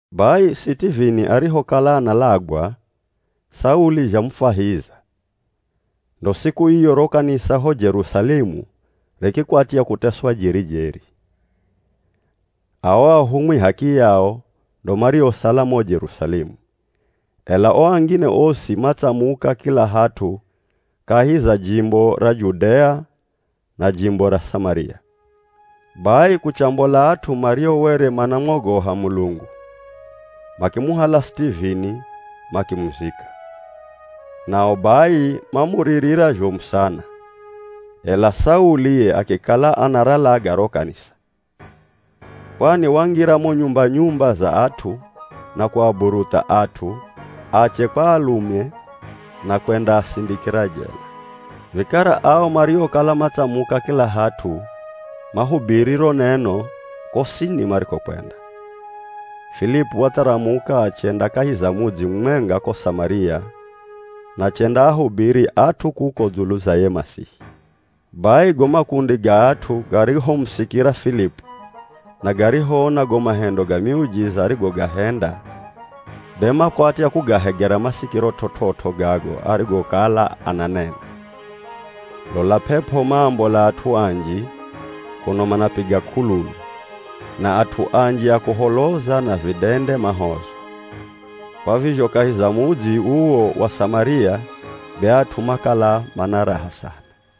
Bai Sitivini arihokala analagwa, Sauli zhamufahiza. Ndo siku iyo ro kanisa ho Jerusalemu rikikwatya kuteswa jeri-jeri. Ao ahumwi h'akiyao ndo mariosala mo Jerusalemu, ela o angine osi matsamuka kila hat'u kahi za jimbo ra Judea na jimbo ra Samaria. Bai kuchambola at'u mario were manamwogoha Mulungu, makimuhala Sitivini makimuzika. Nao bai mamuririra zhomu sana. Ela Sauli ye akikala anaralaga ro kanisa. Kwani wangira mo nyumba-nyumba za at'u na kuaburutha at'u, ache kwa alume na kwendaasindikira jela. Vikara ao mariokala matsamuka kila hat'u mahubiri ro neno kosini marikokwenda. Filipu watharamuka achenda kahi za mudzi mumwenga ko Samaria na achendaahubiri at'u kuko dzulu za ye Masihi. Bai go makundi ga at'u garihomusikira Filipu na garihoona go mahendo ga miujiza arigogahenda, be makwatya kugahegera masikiro t'ot'ot'o gago arigokala ananena. Lola p'ep'o maambola at'u anji kuno manapiga k'ululu, na at'u anji a kuholoza na vidende mahozwa. Kwa vizho kahi za mudzi uwo wa Samaria be at'u makala mana raha sana.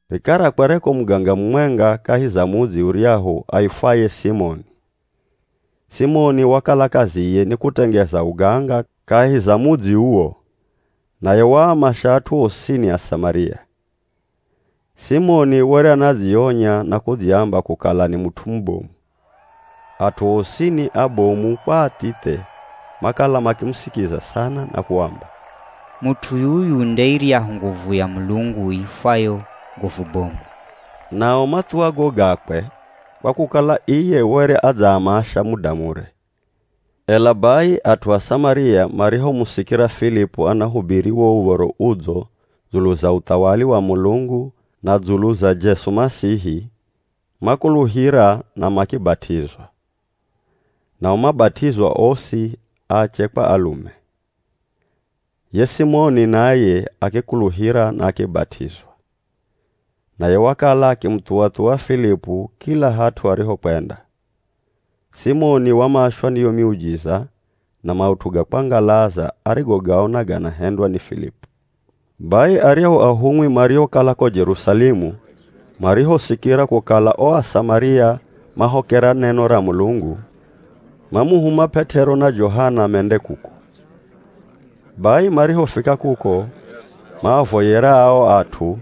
Vikara kwereko muganga mumwenga kahi za mudzi uryahu aifwaye Simoni. Simoni wakala kaziye ni kutengeza uganga kahi za mudzi uwo, naye waamasha at'u osini a Samaria. Simoni were anadzionya na kudziamba kukala ni mut'u mubomu. At'u osini, abomu kwa athithe makala makimusikiza sana na kuamba, “Mut'u yuyu nde iryahu nguvu ya Mulungu iifwayo ‘Nguvu Bomu.’” Nao mathuwa go gakwe kwa kukala iye were adzaamasha muda mure. Ela bai at'u a Samaria marihomusikira Filipu anahubiri wo Uv̱oro Udzo dzulu za uthawali wa Mulungu na dzulu za Jesu Masihi, makuluhira na makibat'izwa. Nao mabat'izwa osi, ache kwa alume. Ye Simoni naye akikuluhira na akibat'izwa. Naye wakala akimuthuwa-thuwa Filipu kila hat'u arihokwenda. Simoni wamashwa ni yo miujiza na maut'u ga kwangalaza arigogaona ganahendwa ni Filipu. Bai aryahu ahumwi mariokala ko Jerusalemu marihosikira kukala o Asamaria mahokera neno ra Mulungu, mamuhuma P'et'ero na Johana mende kuko. Bai marihofika kuko, maavoyera ao at'u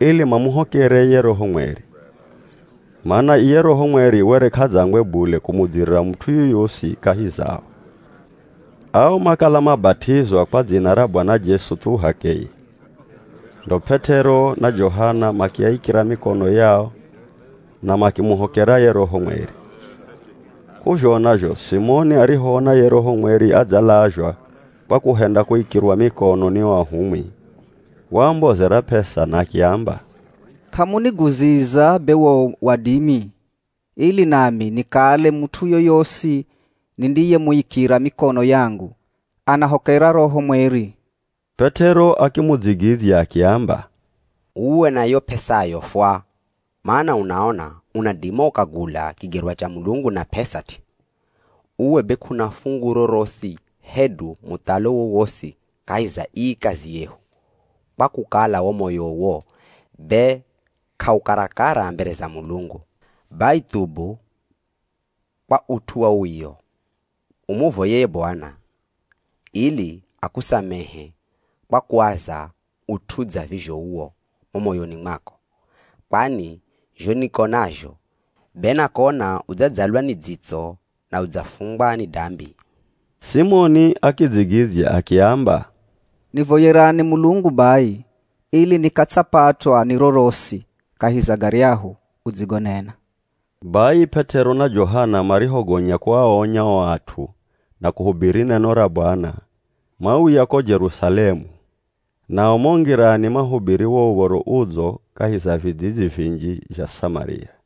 ili mamuhokere ye Roho Mweri. Mana iye Roho Mweri were k'adzangwe bule kumudzirira mut'u yoyosi kahi zao. Ao makala mabat'izwa kwa dzina ra Bwana Jesu thu h'akeye. Ndo P'et'ero na Johana makiaikira mikono yao na makimuhokera ye Roho Mweri. K'uzhona zho Simoni arihoona ye Roho Mweri adzalazhwa kwa kuhenda kuikirwa mikono ni o ahumwi, waambozera p'esa na akiamba, “K'amuniguziza be wo wadimi, ili nami nikale mut'u yoyosi nindiyemuikira mikono yangu, anahokera Roho Mweri.” P'et'ero akimudzigidzya akiamba, “Uwe na yo p'esayo fwa! Mana unaona unadima ukagula kigerwa cha Mulungu na p'esa t'i. Uwe be k'una fungu rorosi hedu muthalo wowosi kahi za ii kazi yehu, kwa kukala wo moyowo be k'aukarakara mbere za Mulungu. Bai thubu kwa ut'u wa uwio, umuvoye ye Bwana, ili akusamehe kwa kuaza ut'u dza vizho uwo mo moyoni mwako. Kwani zho nikonazho, be nakona udzadzalwa ni dzitso na udzafungwa ni dambi.” Simoni akidzigidzya akiamba, “Nivoyerani Mulungu bai ili nikatsapatwa ni rorosi kahi za garyahu udzigonena.” Bai P'et'ero na Johana marihogonya kuaonya o at'u na kuhubiri neno ra Bwana, mauya ko Jerusalemu. Nao mo ngirani mahubiri wo Uv̱oro Udzo kahi za vidzidzi vinji zha Samaria.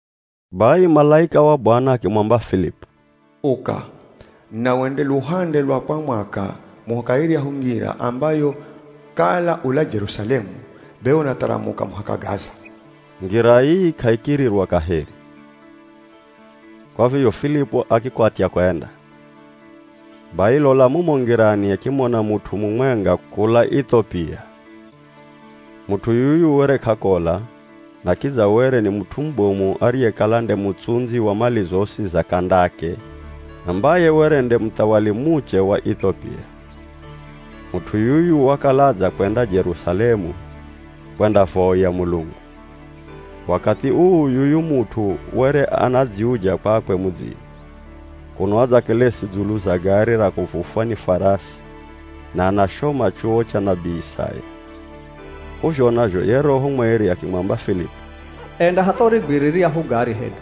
Bai malaika wa Bwana akimwamba Filipu, “Uka, na wende luhande lwa kwa mwaka muhaka iryahu ngira ambayo kala ula Jerusalemu, be unatharamuka muhaka Gaza.” (Ngira ii k'aikirirwa kaheri.) Kwa vizho Filipu akikwatya kwenda. Bai lola mumo ngirani akimona mut'u mumwenga kula Ithopia. Mut'u yuyu were k'akola, na kidza were ni mut'u mubomu ariyekala nde mutsundzi wa mali zosi za K'andake ambaye were nde muthawali muche wa Ithopia. Mut'u yuyu wakala adzakwenda Jerusalemu kwendavoya Mulungu. Wakathi uu yuyu mut'u were anadziuja kwakwe mudzini, kuno adzakelesi dzulu za gari ra kuvufwa ni farasi na anashoma chuwo cha nabii Isaya. K'uzhona zho ye Roho Mweri akimwamba Filipu, “Enda hatha urigwire riryahu gari hedu.”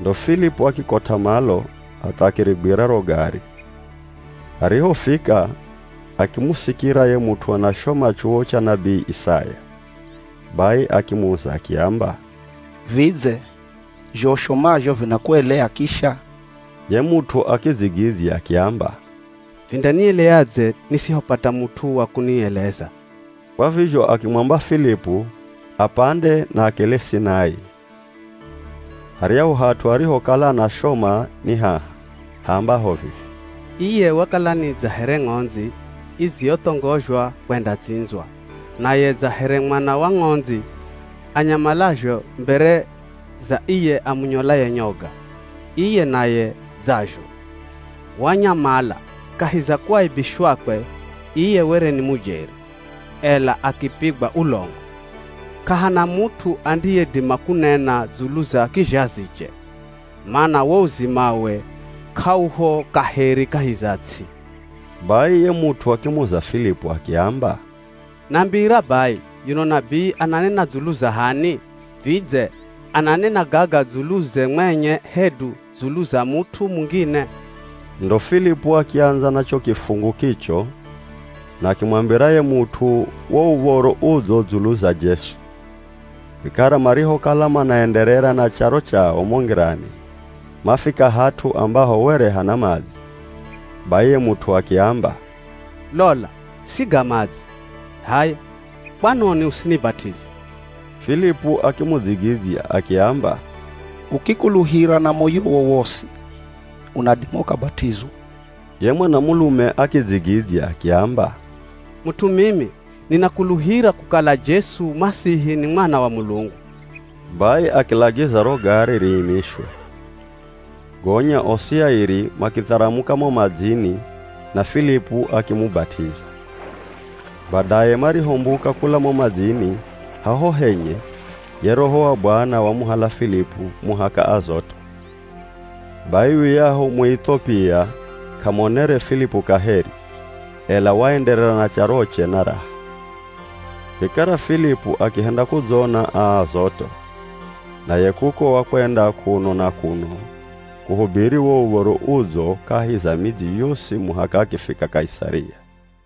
Ndo Filipu akikot'a malo hatha akirigwira ro gari, arihofika akimusikira ye mut'u anashoma chuwo cha nabii Isaya. Bai akimuza akiamba, “Vidze zho ushomazho vinakueleya kisha?” Ye mut'u akidzigidzya akiamba, “Vindanieleadze nisihopata mut'u wa kunieleza?” Kwa vizho akimwamba Filipu apande na akelesi naye. Haryahu hat'u arihokala anashoma ni haha haambaho vivi, “Iye wakala ni dza here ng'ondzi idziyothongozhwa kwendatsindzwa, naye dza here mwana wa ng'ondzi anyamalazho mbere za iye amunyolaye nyoga, iye naye dzazho, wanyamala. Kahi za kuaibishwakwe, iye were ni mujeri, ela akipigwa ulongo. K'ahana mut'u andiyedima kunena dzulu za kizhaziche. Mana wo uzimawe k'auho kaheri kahi za ts'i.” Bai ye mut'u akimuza Filipu akiamba, “Nambira bai yuno nabii ananena dzulu za h'ani, vidze ananena gaga dzuluze mwenye hedu dzulu za mut'u mungine?” Ndo Filipu akiandza na cho kifungu kicho na akimwambira ye mut'u wo Uv̱oro Udzo dzulu za Jesu. Vikara marihokala manaenderera na charo chao mo ngirani, mafika hat'u ambaho were hana madzi, bai ye mut'u akiamba, “Lola! Siga madzi. H'aya, kwanoni usinibat'ize?” [ Filipu akimudzigidzya akiamba, “Ukikuluhira na moyowo wosi, unadima ukabat'izwa.” Ye mwanamulume akidzigidzya akiamba, “Mut'u mimi, ninakuluhira kukala Jesu Masihi ni Mwana wa Mulungu.”] Bai akilagiza ro gari riimishwe. Gonya osi airi, makitharamuka mo madzini na Filipu akimubat'iza. Badaye marihombuka kula mo madzini haho henye, ye Roho wa Bwana wamuhala Filipu muhaka Azoto. Bai yuyahu Muithopia k'amonere Filipu kaheri, ela waenderera na charoche na raha. Vikara Filipu akihenda kudzona a Azoto, naye kuko wakwenda kuno na kuno kuhubiri wo Uv̱oro Udzo kahi za midzi yosi muhaka akifika Kaisaria.